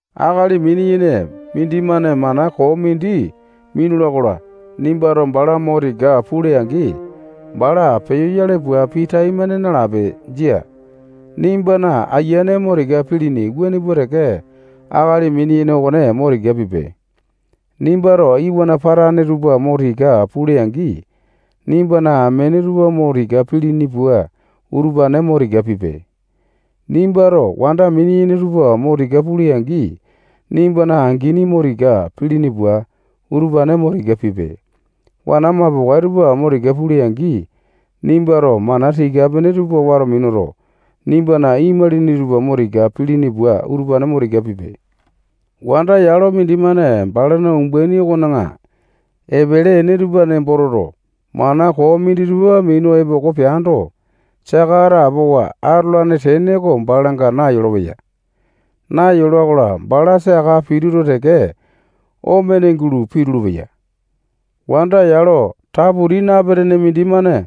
Akali mini-yene mindimane mana koo mindi minula-kola, nimbato bala mo tika pule-angi, bala peyoyale pua pii taimane nalape. Jia. Nimbana ayiane mo tika pilini wuane pua teke, akali mini-yene okone mo tika pipe. Nimbato iwana patane tupa mo tika pule-angi, nimbana amene tupa mo tika pilini pua, utupane mo tika pipe. Nimbato wanda mini-yene tupa mo tika pule-angi, nimbana angini mo tika pilini pua, utupane mo tika pipe. Wana mapokae tupa mo tika pule-angi, nimbato mana tika-pene tupa wato minuto, nimbana imalini tupa mo tika pilini pua utupane mo tika pipe. Wanda yalo mindimane balana umbaini okona epele ene tupa nembo toto, mana koo minditupa minu epoko peando, saka atapowa atolane tene oko balanga nayolo-peya. Nayola-kola, bala saka pituto teke, omene gulo pitulu-peya. Wanda yalo taputi napetene mindimane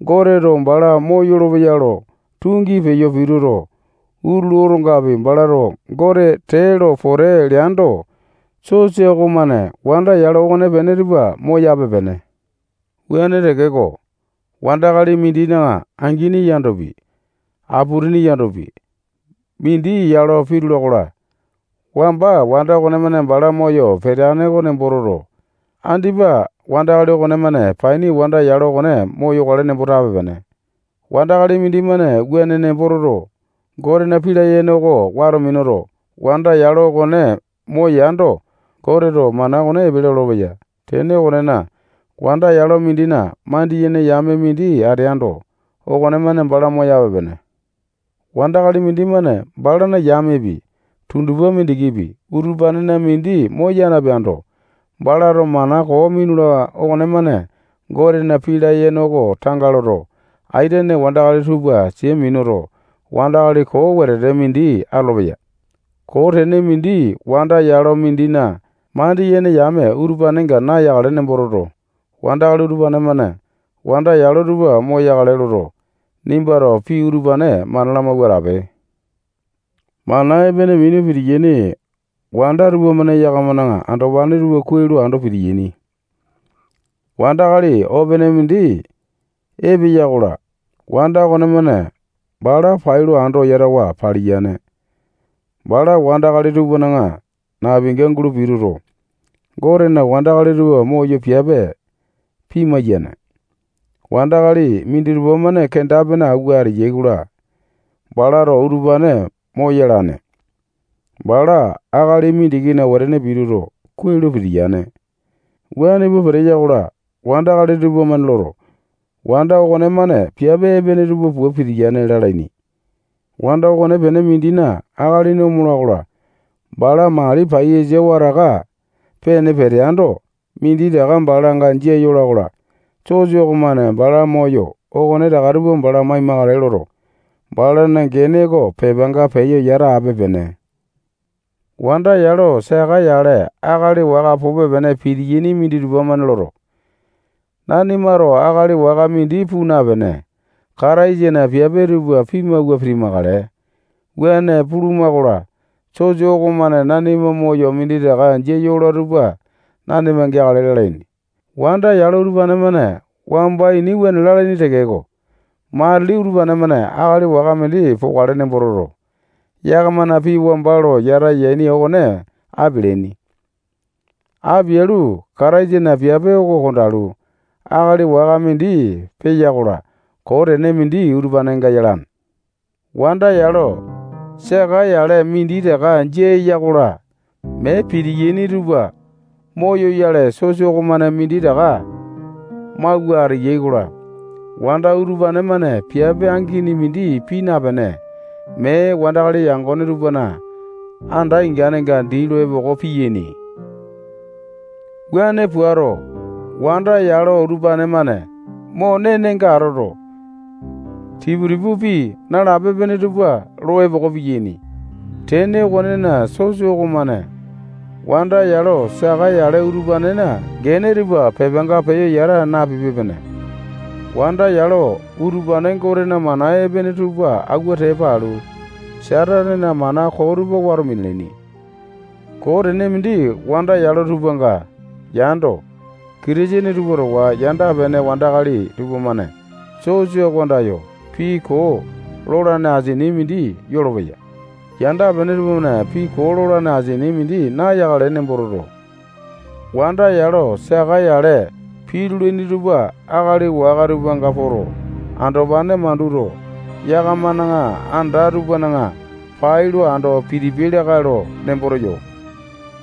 Goteto bala moyolo-peya lo tungi peyo pituto, utulu otongapi, balato Gote tee lo pote leando, sosa okomane wanda yalo okonepene tupa moyape-pene. Wuane tekeko, wandakali mindina angini yandopi, aputini yandopi, mindi yalo pitula-kola, wamba wanda okonemane bala moyo peteane oko nembo toto, andipa wandakali okonemane paini wanda yalo okone moyokale nembo tape-pene. Wandakali mindimane wuane nembo toto, Gotena pii layene oko wato minuto, wanda yalo okone moyando, Goteto mana okone epele olopeya. Tene okonena, wanda yalo mindina mandiyene yame mindi ateando, okonemane bala moyape-pene. Wandakali mindimane balana yamepi, tundupa mindikipi, utupanena mindi moya napeando, balato mana koo minula okonemane Gotena pii layene oko tanga loto, aitene wandakali tupa sia minuto, wandakali koo wetete mindi atolopeya. Koo tene mindi wanda yalo mindina mandiyene yame utupanenga nayakale nembo toto, wandakali utupane-mane wanda yalo tupa moyakale loto, nimbato pii utupane mana lamawua atape. Mana epene minu pitiyaini wanda tupamane yakamana andopane tupa kuai lo ando pitiyaini. Wandakali opene mindi epeya-kola, wanda okonemane bala pailo ando yatawa paliyane. Bala wandakali tupana napinga gulo pituto, Gotena wandakali tupa moyo piape pimai-yane. Wandakali minditupa-mane kenda-pene awua ateyai-kola, balato utupane moyalane. Bala akali mindikina wetene pituto, kuai lo pitiyane. Wuane pua peteya-kola, wandakali tupamane loto, wanda okonemane piape epene tupa pua peteya lalaini. Wanda okonepene mindina akalini omola-kola, bala mali paiyasa wataka pene peteando, minditaka balanga jia yola-kola, sosa okomane bala moyo okonetaka tupa bala maimakale loto, balana gene oko pepanga peyo yata ape-pene. Wanda yalo saka yale akali waka pupe-pene pitiyaini minditupa-mane loto, nanimato akali waka mindi puu napene, Kataisana piape tupa pimawua pitimakale. Wuane puluma-kola, sosa okomane nanima moyo minditaka jia yola tupa nanima geakale lalaini. Wanda yalo utupane-mane wamba ini wuane lalaini tekeko, matili utupane-mane akali waka mindi pokale nembo toto, yakamana pii wamba lo yata yaini okone apialaini. Apialu, Kataisana piape oko kondalu, akali waka mindi peya-kola, koo tene mindi utupanenga yalane. Wanda yalo saka yale minditaka jia eya-kola, mee pitiyaini tupa moyoyale, sosa okomane minditaka mawua ateyai-kola, wanda utupane-mane piape angini mindi pii napene, mee wandakali yangone tupana anda ingane dii lo epoko piyaini. Wuane puato, wanda yalo utupane-mane mo nenenga atoto, tipu-tipu, pii nalape-pene tupa lo epoko piyaini. Tene okonena, sosa okomane wanda yalo saka yale utupanena gene tupa pepanga peyo yata napipe-pene. Wanda yalo utupane Gotena mana epene tupa awua tepa alu, Satanena mana koo tupa wato minalaini. Koo tene mindi wanda yalo tupanga yando, Kitisene tupa towa yanda-pene wandakali tupamane sosa oko andayo pii koo lolane asini mindi yolopeya. Yanda-pene tupamane pii koo lolane asini mindi nayakale nembo toto, wanda yalo saka yale pitulaini tupa akali waka tupanga poto, andopane manduto, yakamana anda tupana pailo ando pitipiai lakae lo nembo teyo.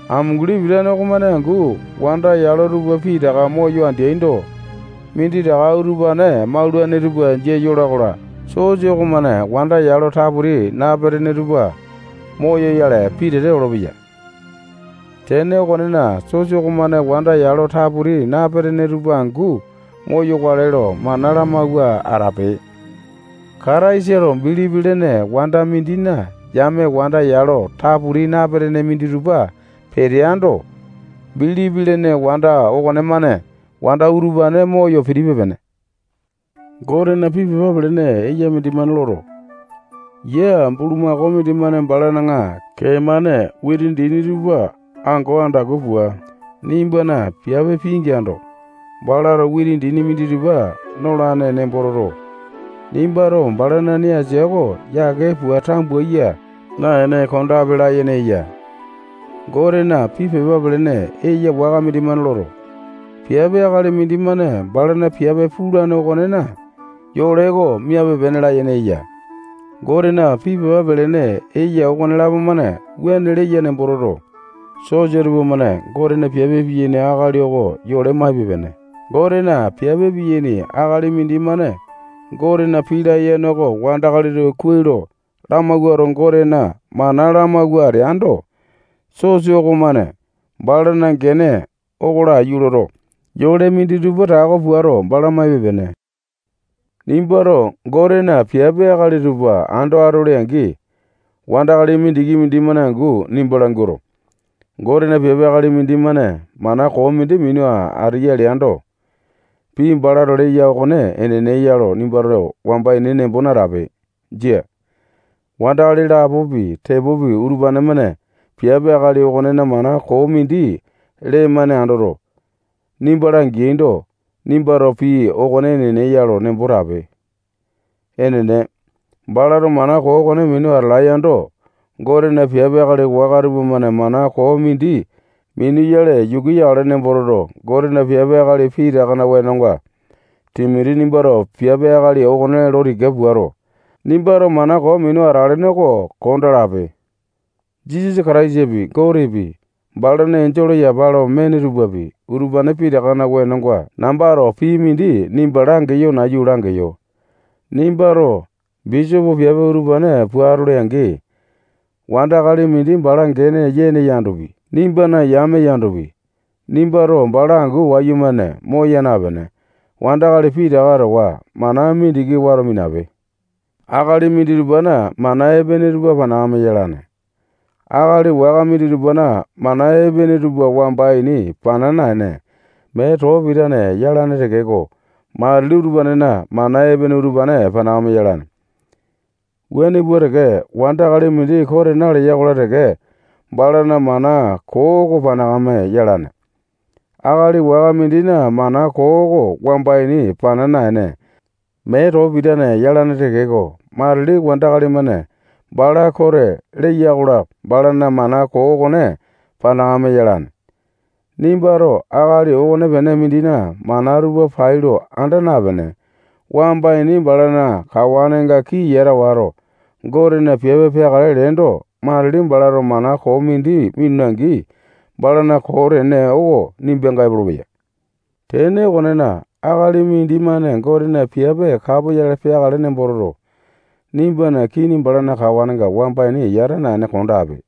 Amunguli pitane okomane angu wanda yalo tupa pitaka moyo ateaindo, minditaka utupane maulane tupa jia yola-kola, sosa okomane wanda yalo taputi napetene tupa moyoyale pitete olopeya. Tene okonena, sosa okomane wanda yalo taputi napetene tupa angu moyakale lo mana lamawua atape. Kataisa lo bilipi lene wanda mindina yame wanda yalo taputi napetene minditupa peteaindo, bilipi lene wanda okonemane wanda utupane moyo pitipe-pene. Gotena pii pepa pelene eya mindimane loto, yia bulumako mindimane balana kee-mane witi dini tupa ango andaku pua, nimbana piape pingeando, balato witi dini minditupa nolane nembo toto, nimbato balana nee asia oko yake pua tambuya naene kondape layene eya. Gotena pii pepa pelene eya waka mindimane loto, piape akali mindimane balana piape pulane okonena yole oko miape-pene layene eya. Gotena pii pepa pelene eya okonelapo-mane wuane leya nembo toto, sosa tupamane Gotena piape piyaini akali oko yole maipe-pene. Gotena piape piyane akali mindimane Gotena pii layene oko wandakali tupa kuai lo lamawuato, Gotena mana lamawua ateando, sosa okomane balana gene oko laiyu loto, yole minditupa tako puato, bala maipe-pene. Nimbato Gotena piape akali tupa ando atole-angi, wandakali mindiki mindimane angu nimba languato, Gotena piape akali mindimane mana koo mindi minu ateya leando, pii balato leya okone enene ya lo nimbato wamba ini nembo natape. Jia. Wandakali lapopi, tepopi, utupane-mane piape akali okonena mana koo mindi lee-mane andoto, nimba langeaindo, nimbato pii okone enene ya lo nembo tape. Enene, balato mana koo okone minu atalae yando, Gotena piape akali waka tupamane mana koo mindi minuyale yuku yakale nembo toto, Gotena piape akali pitakana wenonga Timoti nimbato piape akali okone lo tika puato, nimbato mana koo minu atelene oko kondaa lape. Jisasa Kataisapi, Gotepi, balana enjole yapa lo mene tupapi, utupane pitakana wenonga nambato pii mindi nimba langeyo nayu langeyo. Nimbato bisopo piape utupane pua atole-angi, wandakali mindi bala gene yene yandopi, nimbana yame yandopi, nimbato bala angu wayumane moya napene, wandakali pitaka towa mana mindiki wato minape. Akali minditupana mana epene tupa panakame yalane. Akali waka minditupana mana epene tupa wamba ini pana naene, mee too pitane yalane tekeko, matili utupanena mana epene utupane panakame yalane. Wuane pua teke, wandakali mindi kote naleya-kola teke, balana mana koo oko panakame yalane. Akali waka mindina mana koo oko wamba ini pana naene, mee too pitane yalane tekeko, matili wandakali-mane bala kote leyai-kola, balana mana koo okone panakame yalane. Nimbato akali okonepene mindina mana tupa pailo anda napene, wamba ini balana kawanenga kii yata wato, Gotena piape peakale leendo, matili balato mana koo mindi minula-angi, balana koo tene oko nimbanga epolopeya. Tene okonena, akali mindimane Gotena piape kapoyale peakale nembo toto, nimbana kini balana kawanenga wamba ini yata naene kondape.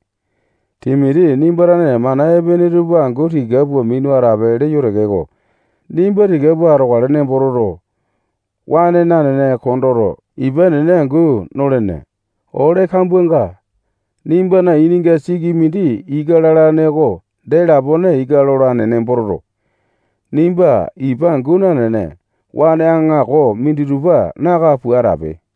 Timoti nimba tane mana epene tupa angu tika pua minu atape leyo tekeko, nimba tika pua atokale nembo toto, waene nanene kondoto, ipa enene angu nolene. Ole kambuanga nimba ininga siki mindi ika lalane oko dee lapone ika lolane nembo toto, nimba ipa angu nanene, waene aŋako minditupa naka pua atape.